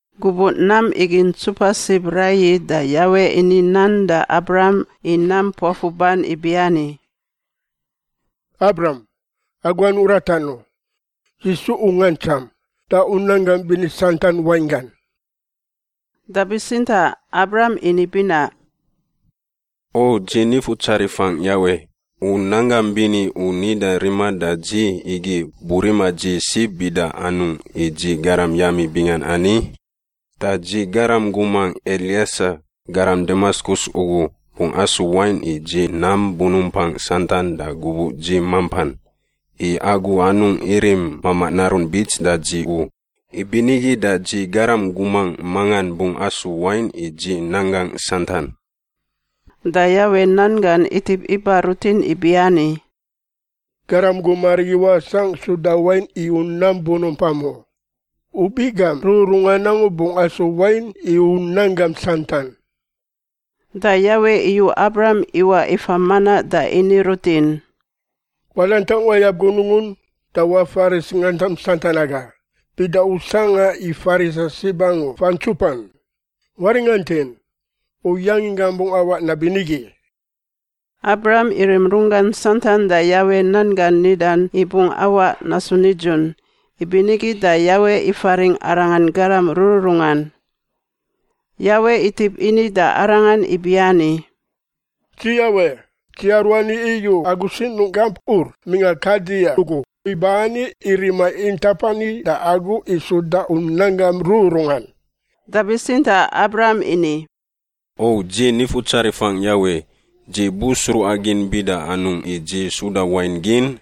Gubuꞌ nam igi ntsupa sib raiyi da Yawe ini nan da Abram i nam puafuban ibiani, “Abram, agu anungꞌ ratan u. Dzi su u ngantsam da u nanggam bini santan wainggan.” Da bitsintaꞌ Abram ini binaꞌ, “O dzi Nifutsarifangꞌ Yawe, u nanggam bini u nida rima da dzi igi burima dzi sib bida anungꞌ i dzi garam yami bingan ani? Da dzi garam gumangꞌ Elieser, garam Damaskus ugu, bungꞌ asu wain i dzi nam bunumpangꞌ santan da gubuꞌ dzi mampan. I Agu anungꞌ irim mamaꞌ narun bits da dzi u, ibinigi da dzi garam gumangꞌ mangan bungꞌ asu wain i dzi nanggangꞌ santan.” Da Yawe nan gan itip iba rutin ibiani, “Garam gum arigi wasangꞌ suda wain i u nam bunumpam u; u biꞌ gam rururungan angu bungꞌ asu wain i u nanggam santan.” Da Yawe iyu Abram iwaꞌ ifa manaꞌ da ini rutin, “Wadantangꞌ wayab gunungun da wafaris ngantam santan aga, bida u sangꞌa i farisa sib angu fantsupan. Waringantin! U yanginggam bungꞌ awaꞌ nabinigi.” Abram irim runggan santan da Yawe nan gan nidan i bungꞌ awaꞌ nasu nidzun, ibinigi da Yawe ifaringꞌ arangan garam rururungan. Yawe itip ini da arangan ibiani, “Dzi Yawe, Dzi aruani iyu agu sinungꞌ gamp Ur mingꞌa Kaldia ugu iba ani i rima intap ani da agu i suda u nanggam rururungan.” Da bitsintaꞌ Abram ini, “O dzi Nifutsarifangꞌ Yawe, dzi bu sruꞌagin bida anungꞌ i dzi suda wain gin?”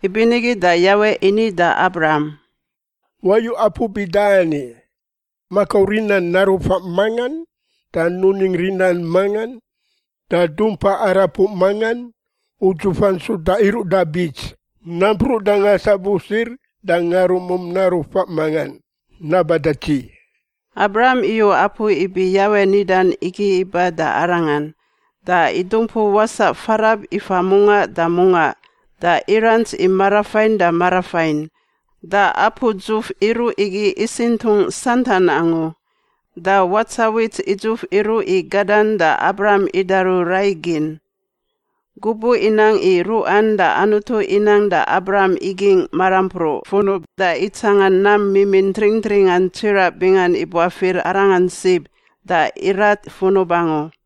Ibinigi da Yawe ini da Abram, “Wayu apu bida ani: makau rinan naru faꞌ mangan da nuning rinan mangan da dumpa arapuꞌ mangan, udzufan suda iruꞌ da bits, nampruꞌ da ngasabusir da ngarumum naru faꞌ mangan— naba da dzi.” Abram iyu apu ibi Yawe nidan igi iba da Arangan, da idumpu wasaꞌ farab ifa mungaꞌ da mungaꞌ da irants i marafain da marafain. Da apu dzuf iruꞌ igi isintungꞌ santan angu. Da watsawits idzuf iruꞌ i gadan da Abram idaru rai gin. Gubuꞌ inang i ruꞌan da Anutu inang da Abram igingꞌ marampruꞌ funub da itsangan nam mimin tringtringan tsiraꞌ bingan ibuafir arangan sib da irat funub angu.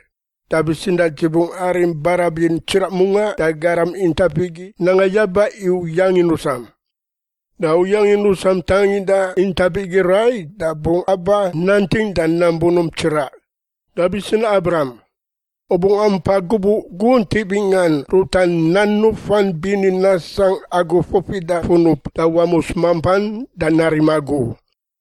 Da bitsintaꞌ dzi bungꞌ arim barabin tsiraꞌ mungaꞌ da garam intap igi nanga yaba i u yangin rusam. Da u yangin rusam tanginda intap igi rai da bungꞌ aba nanting da nam bunump tsiraꞌ. Da bitsintaꞌ Abram, u bungꞌ ampa gubuꞌ guntiꞌ bingan ruta nan nufan bini nasangꞌ agu fufida funub da wamus mampan da narim agu.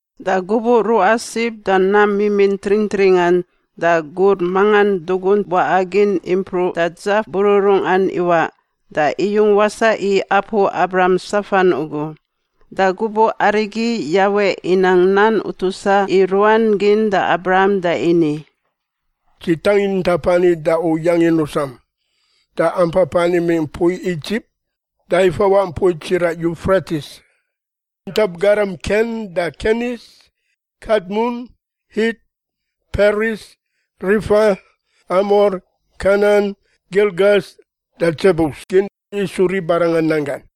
Da gubuꞌ ruꞌa sib da nam mimin tringtringan da gur mangan dugunt waꞌa gin impruꞌ da dzaf bururungan iwaꞌ da iyung wasaꞌ i apu Abram safan ugu. Da gubuꞌ arigi, Yawe inang nan utusa i ruan gin da Abram da ini, “Dzi tangin intap ani da u yangin rusam, da ampapan imingꞌ mpui Idzip da ifawaꞌ mpui tsiraꞌ Yufretis— intap garam Ken da Kenis, Kadmun, Hit, Peris, Refa, Amor, Kanan, Girgas da Dzebus gin isu ribarangan nanggan.”